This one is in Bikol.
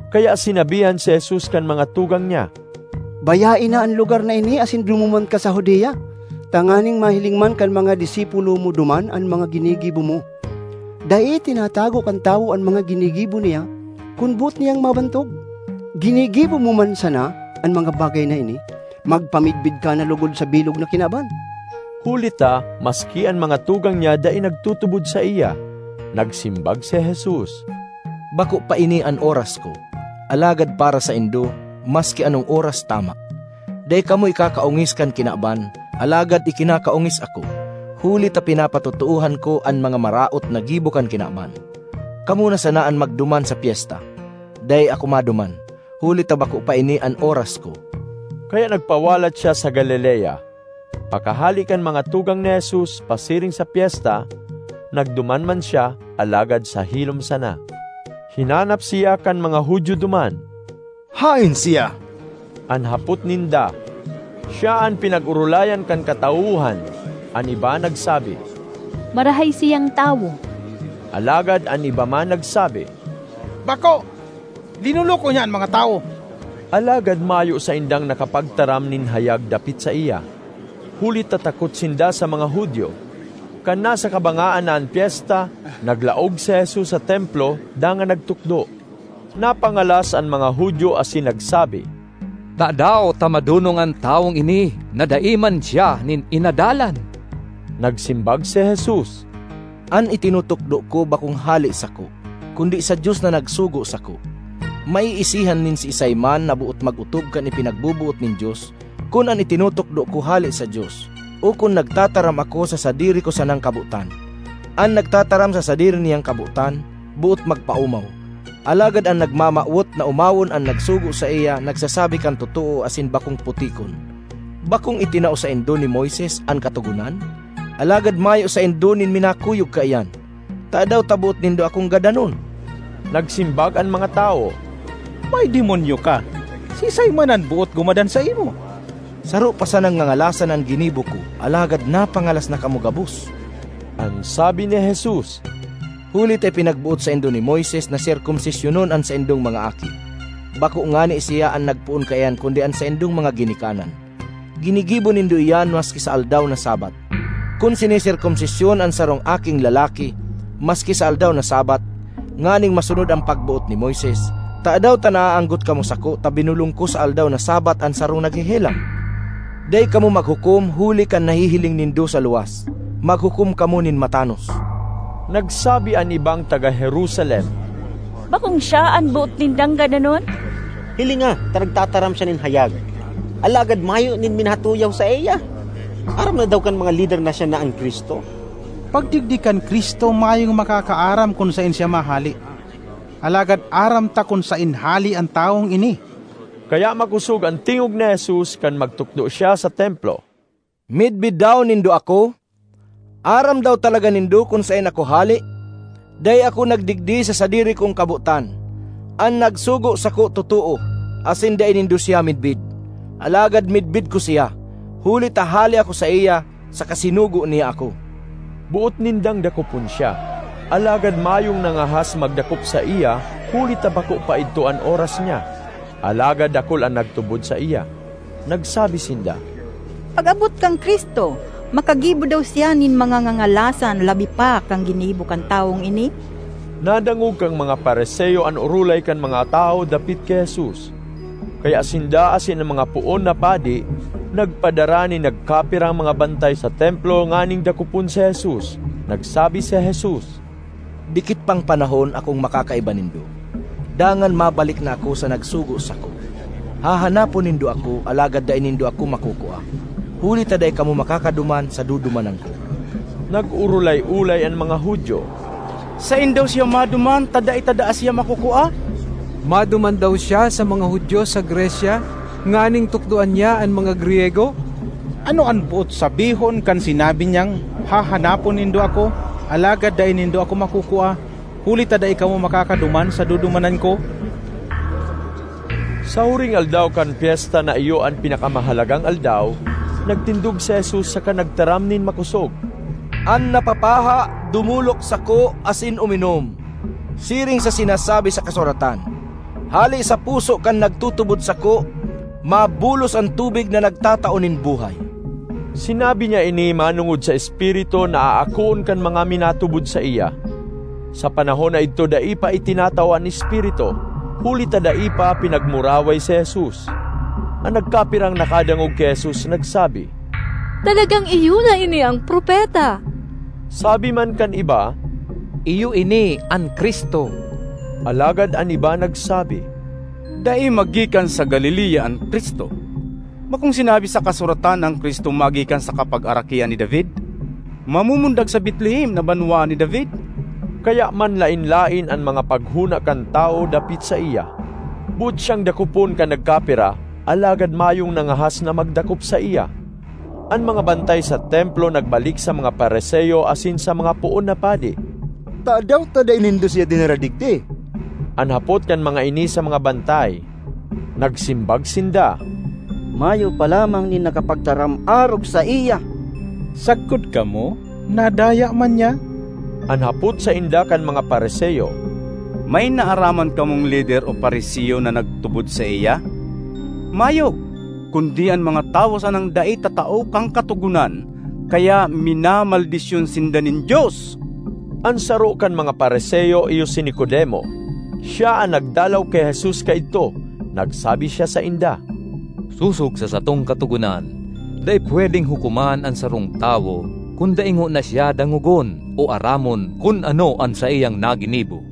Kaya sinabihan si Jesus kan mga tugang niya, “Bayae na an lugar na ini asin dumuman ka sa Judea, tanganing mahiling man kan mga disipulo mo duman an mga ginigibo mo. Dai tinatago kan tawo an mga ginigibo niya kun boot niyang mabantog. Ginigibo mo man sana an mga bagay na ini, magpamidbid ka na logod sa bilog na kinaban!” (Huli ta maski an mga tugang niya dai nagtutubod saiya.) Nagsimbag si Jesus, “Bako pa ini an oras ko, alagad para saindo, maski anong oras tama. Dai kamo ikakaongis kan kinaban, alagad ikinakaongis ako, huli ta pinapatotoohan ko an mga maraot na gibo kan kinaban. Kamo na sana an magduman sa pyesta. Dai ako maduman, huli ta bako pa ini an oras ko.” Kaya nagpawalat siya sa Galilea. Pakahale kan mga tugang ni Jesus pasiring sa pyesta, nagduman man siya, alagad sa hilom sana. Hinanap siya kan mga Judio duman. “Haen siya?” an hapot ninda. Siya an pinag-orolayan kan katawohan. An iba nagsabi, “Marahay siyang tawo”; alagad an iba man nagsabi, “Bako, linoloko niya an mga tawo.” Alagad mayo saindang nakapagtaram nin hayag dapit saiya, huli ta takot sinda sa mga Judio. Kan nasa kabangaan na an pyesta, naglaog si Jesus sa Templo dangan nagtukdo. Napangalas an mga Judio asin nagsabi, “Tadaw ta madonong an tawong ini na dai man siya nin inadalan?” Nagsimbag si Jesus, “An itinutukdo ko bakong hale sako, kundi sa Dios na nagsugo sako. Maiisihan nin siisay man na boot mag-otob kan ipinagboboot nin Dios, kun an itinutukdo ko hale sa Dios, o kun nagtataram ako sa sadiri ko sanang kabotan. An nagtataram sa sadiri niyang kabotan, boot magpaomaw. Alagad an nagmamawot na omawon an nagsugo saiya nagsasabi kan totoo asin bakong putikon. Bakong itinao saindo ni Moises an Katogonan? Alagad mayo saindo nin minakuyog kaiyan. Tadaw ta boot nindo akong gadanon?” Nagsimbag an mga tawo, “May demonyo ka! Siisay man an boot gumadan saimo?” ”Saro pa sanang ngangalasan an ginibo ko alagad napangalas na kamo gabos!” an sabi ni Jesus. ”Huli ta ipinagboot saindo ni Moises na serkomsisyonon an saindong mga aki (bako ngani siya an nagpoon kaiyan kundi an saindong mga ginikanan), ginigibo nindo iyan maski sa aldaw na Sabbath. Kun siniserkomsisyon an sarong aking lalaki maski sa aldaw na Sabbath nganing masunod an pagboot ni Moises, tadaw ta naaanggot kamo sako ta binolong ko sa aldaw na Sabbath an sarong naghehelang? Dai kamo maghukom huli kan nahihiling nindo sa luwas; maghukom kamo nin matanos.” Nagsabi an ibang taga Jerusalem, “Bakong siya an boot nindang gadanon? Hilinga ta nagtataram siya nin hayag, alagad mayo nin minatuyaw saiya! Aram na daw kan mga lider na siya na an Cristo! Pagdigdi kan Cristo mayong makakaaram kun saen siya mahale. Alagad aram ta kun saen hale an tawong ini.” Kaya makosog an tingog ni Jesus kan magtukdo siya sa Templo, “Midbid daw nindo ako? Aram daw talaga nindo kun saen ako hale? Dai ako nagdigdi sa sadiri kong kabotan. An nagsugo sako totoo, asin dai nindo siya midbid. Alagad midbid ko siya, huli ta hale ako saiya saka sinugo niya ako.” Boot nindang dakopon siya, alagad mayong nangahas magdakop saiya, huli ta bako pa idto an oras niya. Alagad dakul an nagtubod saiya. Nagsabi sinda, “Pag-abot kan Cristo, makagibo daw siya nin mga ngangalasan labi pa kan ginibo kan tawong ini?” Nadangog kan mga Fariseo an orolay kan mga tawo dapit ki Jesus, kaya sinda asin an mga poon na padi nagpadara nin nagkapirang mga bantay sa Templo nganing dakopon si Jesus. Nagsabi si Jesus, “Dikit pang panahon akong makakaiba nindo, dangan mabalik na ako sa nagsugo sako. Hahanapon nindo ako, alagad dai nindo ako makukua; huli ta dai kamo makakaduman sa dudumanan ko.” Nag-orolay-olay an mga Judio, “Saen daw siya maduman ta dai ta daa siya makukua? Maduman daw siya sa mga Judio sa Grecia nganing tukdoan niya an mga Griyego? Ano an boot sabihon kan sinabi niyang, ‘Hahanapon nindo ako, alagad dai nindo ako makukua, huli ta dai kamo makakaduman sa dudumanan ko’?” Sa huring aldaw kan pyesta na iyo an pinakamahalagang aldaw, nagtindog si Jesus saka nagtaram nin makosog, “An napapaha dumolok sako asin uminom. Siring sa sinasabi sa kasuratan, ‘Hale sa puso kan nagtutubod sako, mabulos an tubig na nagtatao nin buhay.’” Sinabi niya ini manongod sa Espiritu na aakoon kan mga minatubod saiya. Sa panahon na idto dai pa itinatao an Espiritu, huli ta dai pa pinagmuraway si Jesus. An nagkapirang nakadangog ki Jesus nagsabi, “Talagang iyo na ini an Propeta!” Sabi man kan iba, “Iyo ini an Cristo!” Alagad an iba nagsabi, “Dai magikan sa Galilea an Cristo! Bakong sinabi sa kasuratan na an Cristo magikan sa kapagarakian ni David, mamumundag sa Betlehem na banwaan ni David?” Kaya manlaen-laen an mga paghona kan tawo dapit saiya. Boot siyang dakopon kan nagkapira, alagad mayong nangahas na magdakop saiya. An mga bantay sa Templo nagbalik sa mga Fariseo asin sa mga poon na padi. “Tadaw ta dai nindo siya dinara digdi?” an hapot kan mga ini sa mga bantay. Nagsimbag sinda, “Mayo pa lamang nin nakapagtaram arog saiya!” ”Sagkod kamo nadaya man niya?” an hapot sainda kan mga Fariseo. ”May naaraman kamong lider o Fariseo na nagtubod saiya? Mayo, kundi an mga tawo sanang dai tatao kan Katogonan. Kaya minamaldisyon sinda nin Dios!” An saro kan mga Fariseo iyo si Nicodemo; siya an nagdalaw ki Jesus kaidto. Nagsabi siya sainda, ”Sosog sa satong Katogonan, dai pwedeng hukoman an sarong tawo kun dai ngona siya dangogon o aramon kun ano an saiyang naginibo.”